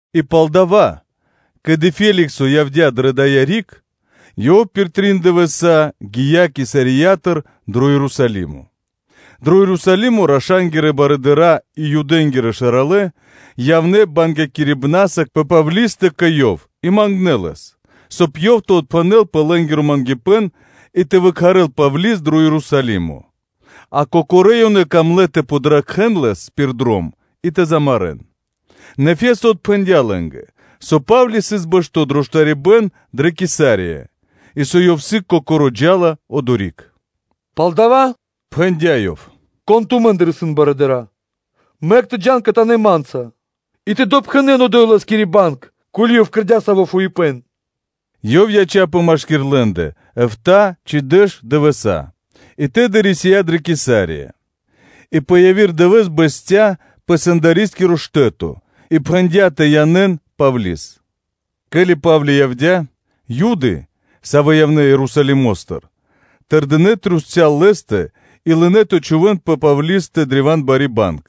И палдава́, ке́ли Феликсо явдя́ пэ дая́ риг, ёв пир трин дывэса́ гия́ Кесариятыр дро Ерусалимо. Дро Ерусалимо раша́нгирэ барыдыра́ и Юдэ́нгирэ шэралэ́ явнэ́ бангякирибнаса пэ Павлистэ кэ ёв и мангнэ́ лэс, соб (кай) ёв тэ отпхэнэл пэ лэ́нгиро мангипэ́н и тэ выкхарэл Павли́с дро Ерусалимо; а кокорэ́ ёнэ камлэ́ тэ подракхэн лэс пир дром и тэ замарэ́н. Нэ Фесто отпхэндя́ лэ́нгэ, со Па́вли сыс бэшто́ дро штарибэ́н дрэ Кесария, и со ёв сыг кокоро́ джа́ла одори́к. “Палдава́, – пхэндя́ ёв, – кон тумэ́ндыр исын барыдыра́, мэк тэ джа́н кхэтанэ́ ма́нца, и тэ допхэнэн одо́й лэ́скири банг, ко́ли ёв кэрдя́ саво́ фуипэ́н.” Ёв яця́пэ машки́р лэ́ндэ эфта́ (битринэ́нгиро дэш) ци дэш дывэса́, а тэды рисия́ дрэ Кесария, и пэ яви́р дывэ́с бэсця́ пэ сэндарискиро штэ́то и пхэндя́ тэ янэ́н Павли́с. Ке́ли Па́вли явдя́, Юды, савэ́ явнэ́ Ерусалимо́стыр, тэрдинэ́ трусця́л лэ́стэ и лынэ́ тэ чхувэ́н пэ Павлистэ древа́н бари банг,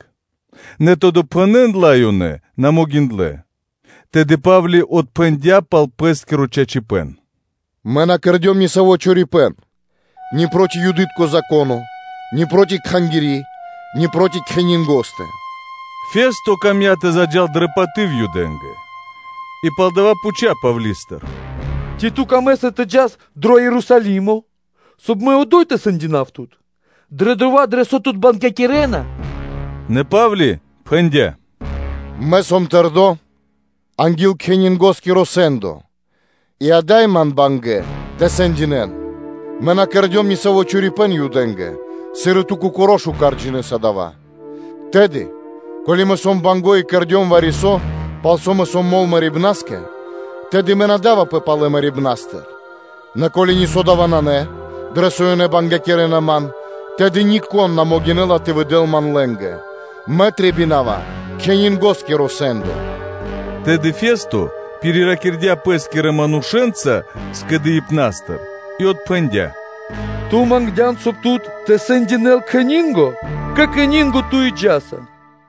нэ тэ допхэнэн ла ёнэ на могиндлэ́. Тэды Па́вли отпхэндя́ пал пэ́скиро чачипэ́н: “Мэ на кэрдём ни саво́ чорипэ́н ни проти Юды́тко Зако́но, ни проти Кхангири́, ни проти кхенинго́стэ (кесарёстэ).” О Фесто камдя́ тэ заджа́л дрэ паты́в Юдэ́нгэ, и палдава́ пхуця́ Павли́стыр: “Ци ту камэ́са тэ джас дро Ерусалимо, соб (кай) мэ одо́й тэ сэндинав тут дрэ дова́, дрэ со тут бангякирэна?” Нэ Па́вли пхэндя́: “Мэ сом тэрдо́ анги́л кхенингоскиро сэ́ндо, и ада́й ман исын бангэ́ тэ сэндинэ́н; мэ на кэрдём нисаво́ чорипэ́н Юдэ́нгэ, сыр и ту кокоро́ шука́р джинэ́са мишто́ дава́. Тэды, ко́ли мэ сом банго́ и кэрдём вари-со, пал со мэ сом мол мэрибна́скэ, тэды мэ на давапэ палэ мэрибна́стыр; нэ ко́ли нисо́ дава́ нанэ, дрэ со ёнэ бангякирэна ман, тэды нико́н на могинэ́ла тэ выдэл ман лэ́нгэ. Мэ трэбинава кхенингоскиро сэ́ндо.” Тэды Фесто пириракирдя пэ́скирэ манушэ́нца скэдыибна́стыр и отпхэндя́: “Ту мангдян, соб (кай) тут тэ сэндинэл кхенинго, кэ кхенинго ту и джа́са.”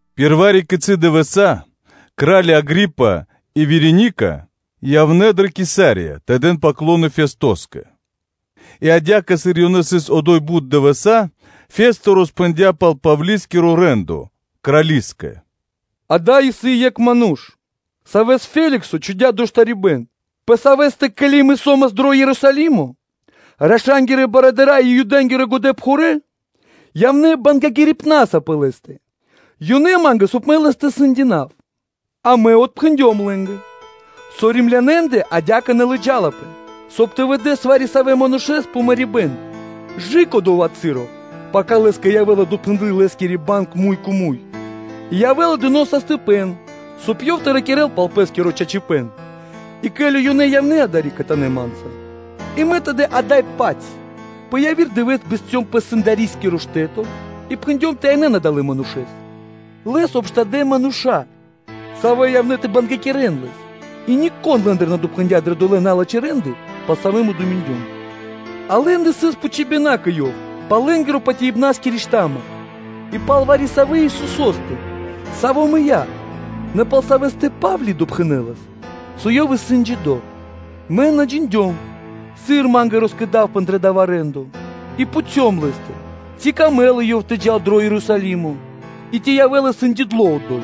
Пир вари-кицы́ дывэса́ кра́ли Агри́па и Вереника явнэ́ дрэ Кесария тэ дэн “паклоно” Фестоскэ. И адя́кэ, сыр ёнэ сыс одо́й бут дывэса́, Фесто роспхэндя́ пал Павли́скиро рэ́ндо крали́скэ: “Ада́й исын екх ману́ш, савэ́с Феликсо чхудя́ дро штарибэ́н, пэ савэ́стэ, ке́ли мэ со́мас дро Ерусалимо раша́нгирэ барыдыра́ и Юдэ́нгирэ годэпхурэ́ явнэ́ бангякирибнаса пэ лэ́стэ; ёнэ мангнэ́, соб (кай) мэ лэс тэ сэндинав: а мэ отпхэндём лэ́нгэ, со Римлянэндэ адя́кэ на лыджалапэ, соб (кай) тэ выдэс вари-савэ́ манушэ́с пэ мэрибэ́н; кэ/жы́ко дова́ часо, пака лэ́скэ явэ́ла допхэндлы лэ́скири банг муй кэ муй и явэ́ла сашты́ (можно), соб (кай) ёв тэ ракирэ́л пал пэ́скиро чачипэ́н. И ке́ли ёнэ явнэ́ адари́к кхэтанэ́ ма́нца, и мэ тэды на отчхудём, нэ пэ яви́р дывэ́с, бэсцём пэ сэндарискиро штэ́то и пхэндём тэ янэ́н адалэ́ манушэ́с: лэс обштадэ мануша́, савэ́ явнэ́ тэ бангякирэн лэс и нико́н лэ́ндыр на допхэндя дрэ долэ́ налачхэ́ рэ́нды, пал савэ́ мэ думиндём; а лэ́ндэ сыс пхучибэна кэ ёв пал лэ́нгирэ патяибнаскири шта́ма (сво́до), и пал вари-савэ́ Исусо́стэ, саво́ мыя́, нэ пал Савэ́стэ Па́вли допхэнэлас, со Ёв исын джидо́. Мэ на джиндём, сыр ма́нгэ роскэдавпэ дрэ дава́ рэ́ндо, мэ пхуцём лэ́стыр, ци камэ́ла ёв тэ джал дро Ерусалимо и тэ явэ́л сэндиндло одо́й?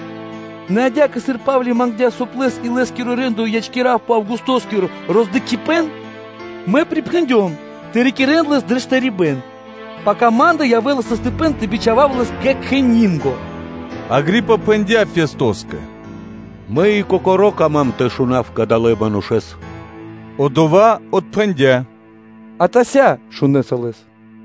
Нэ адя́кэ, сыр Па́вли мангдя́, соб (кай) лэс и лэ́скиро рэ́ндо ячкирав пэ Августоскиро роздыкхибэн, мэ припхэндём тэ рикирэ́н лэс дрэ штарибэ́н, пака ма́нгэ явэ́ла сашты́ тэ бичхавав лэс кэ кхенинго.” Агри́па пхэндя́ Фестоскэ: “Мэ и кокоро́ кама́м тэ шунав кадалэ́ манушэ́с.” Одова́ отпхэндя́: “Атася́ шунэса лэс.”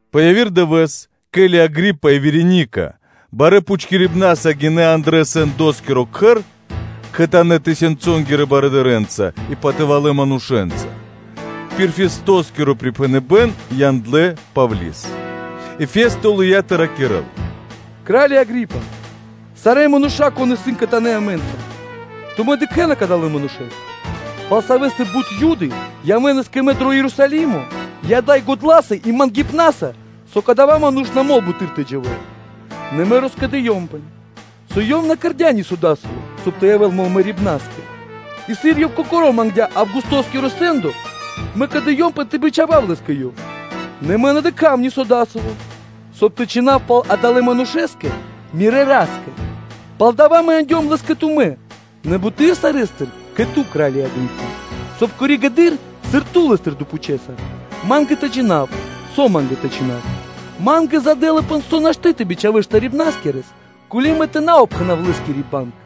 Пэ яви́р дывэ́с, ке́ли Агри́па и Вереника барэ́ пхутькирибнаса гинэ́ андрэ́ сэндоскиро кхэр кхэтанэ́ тысёнцэнгирэ барыдырэ́нца и патывалэ́ манушэ́нца, пир Фестоскиро припхэныбэ́н яндлэ́ Павли́с. И Фесто лыя́ тэ ракирэ́л: “Кра́лё Агри́па! Сарэ́ мануша́, кон исын кхэтанэ́ амэ́нца, тумэ́ дыкхэ́на кадалэ́ манушэ́с, пал савэ́стэ бут Юды явэ́нас кэ мэ дро Ерусалимо и ада́й годла́са и мангипнаса, со кадава́ ману́ш на мол буты́р тэ дживэ́л. Нэ мэ роскэдыёмпэ, со ёв на кэрдя́ нисо́ дасаво, соб (кай) тэ явэ́л мол мэрибна́скэ, и сыр ёв кокоро́ мангдя́ Августоскиро сэ́ндо, мэ кэдыёмпэ тэ бичхавав лэс кэ ёв; нэ мэ на дыкха́ва нисо́ дасаво, со тэ чхинав пал адалэ́ манушэ́стэ мирэ́ Ра́скэ. Палдава́ мэ яндём лэс кэ тумэ́, нэ буты́р сарэ́стыр кэ ту, кра́лё Агри́па, соб (кай) коригэды́р (позжэ), сыр ту лэ́стыр допхучэса, ма́нгэ тэ джина́в, со ма́нгэ тэ чхинав. Ма́нгэ здэлапэ, со нашты́ тэ бичхавэс штарибнаскирэс, ко́ли мэ тэ на упхэнав пэ лэ́скири банг.”